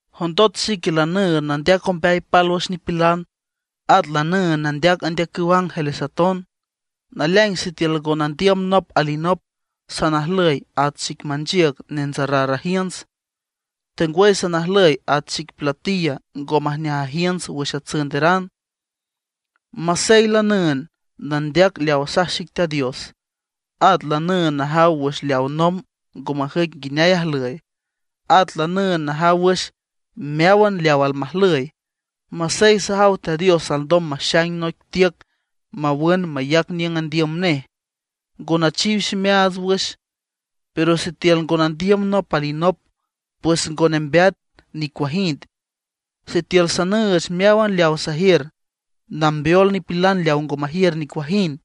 Jondot xique lanüünd nandeac ombeay pálwüx nipilan, at lanüünd nandeac andeacüw ángeles aton, naleaing sitiül ngo nandiüm nop alinop, sanajlüy at xic manchiüc nentsarar ajiünts, tengwüy sanajlüy at xic platilla ngo majneaj ajiünts wüx atsünderan. Masey lanüünd nandeac leaw asaj xic Teat Dios, at lanüünd najaw wüx leaw nomb ngo majüic nguineay ajlüy, at lanüünd najaw wüx meáwan leaw almajlüy; masey sajaw Teat Dios alndom maxaing noic tiüc mawün mayac niüng andiüm nej, ngo nachiw ximeaats wüx; pero sitiül ngo nandiüm nop alinop, pues ngo nembeat nicuajind. Sitiül sanüüch meáwan leawa sajiür nambeol nipilan leaw ngo majiür nicuajind;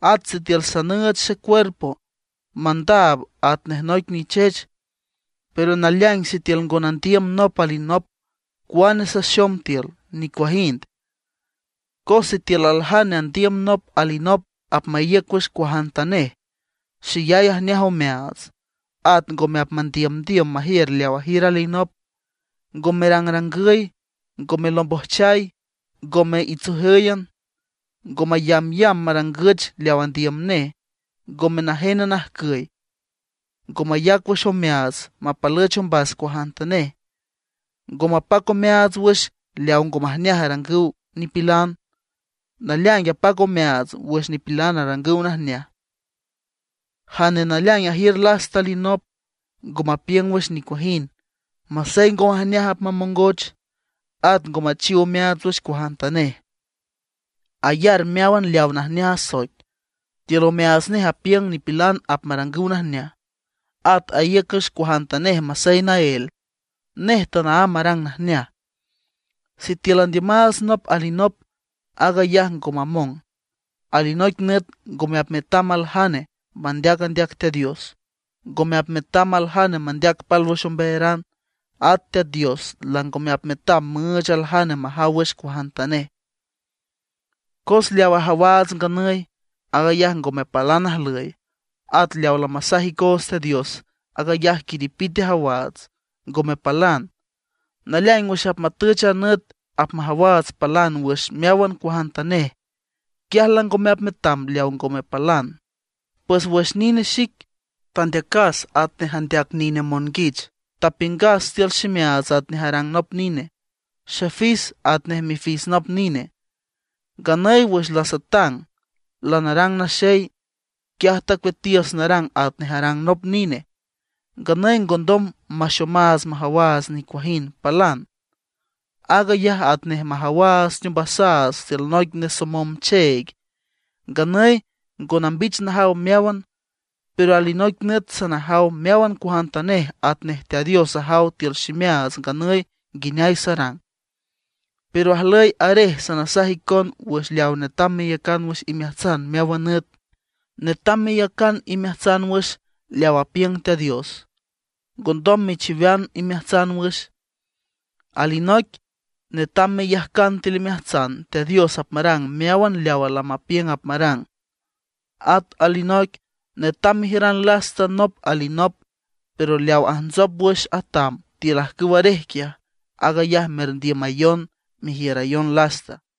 at sitiül sanüüch xecuerpo mandaab atnej noic nichech, pero naleaing sitiül ngo nandiüm nop alinop, cuane saxom tiül, nicuajind. Cos sitiül aljane andiüm nop alinop apmaíüc wüx cuajantanej, xeyay ajneaj omeaats. At ngome apmandiümdiüm majiür leaw ajiür alinop, ngo merangrangüy, ngome lombojchay, ngome itsojǘyan, ngo mayambyamb marangüch leaw andiüm nej, ngome najen ajcüy, ngo mayac wüx omeaats mapalüch ombas cuajantanej. Ngo mapac omeaats wüx leaw ngo majneaj arangüw nipilan; naleaing apac omeaats wüx nipilan arangüw najneaj. Jane naleaing ajiür lasta alinop, ngo mapiüng wüx nicuajind, masey ngo majneaj apmamongoch. At ngo machiw omeaats wüx cuajantanej, ayar meáwan leaw najneaj asoic. Tiül omeaats nej apiüng nipilan apmarangüw najneaj. At aíüc wüx cuajantanej masey naél, nej tanaámb arang najneaj. Sitiül andiümaats nop alinop, aag ayaj ngo mamong. Alinoic nüt ngome apmetam aljane mandeac andeac Teat Dios; ngome apmetam aljane mandeac pálwüx ombeayaran; at Teat Dios langome apmetam müüch aljane majaw wüx cuajantanej. Cos leaw ajawaats nganüy, aag ayaj ngome palan ajlüy; at leaw lamasaj icoots Teat Dios, aag ayaj quiripite ajawaats, ngome palan. Naleaing wüx apmatüch a nüt apmajawaats palan wüx meáwan cuajantanej, quiaj langome apmetam leaw ngome palan. Pues wüx nine xic, tandeacas atnej andeac nine monguich, tapiüngas tiül ximeaats atnej arang nop nine, xefis atnej mifis nop nine. Nganüy wüx lasatang lanarang naxey, quiaj tacueatiüs narang atnej arang nop nine. Nganüy ngondom maxomaats majawaats nicuajind palan; aag ayaj atnej majawaats teombasaats tiül noic nesomom cheeg. Nganüy ngo nambich najaw meáwan, pero alinoic nüt sanajaw meáwan cuajantanej atnej Teat Dios ajaw tiül ximeaats nganüy nguineay sarang. Pero ajlüy arej sanasaj icon wüx leaw netam meyacan wüx imeajtsan meáwan nüt. Netam meyacan imeajtsan wüx leaw apiüng Teat Dios, ngondom mechiwean imeajtsan wüx. Alinoic: Netam meyajcan tiül imeajtsan Teat Dios apmarang meáwan leawa lamapiüng apmarang. At alinoic: Netam mejiüran lasta nop alinop. Pero leaw ajntsop wüx atam tiül ajcüw arej quiaj, aag ayaj merndiümayon, merjiürayon lasta.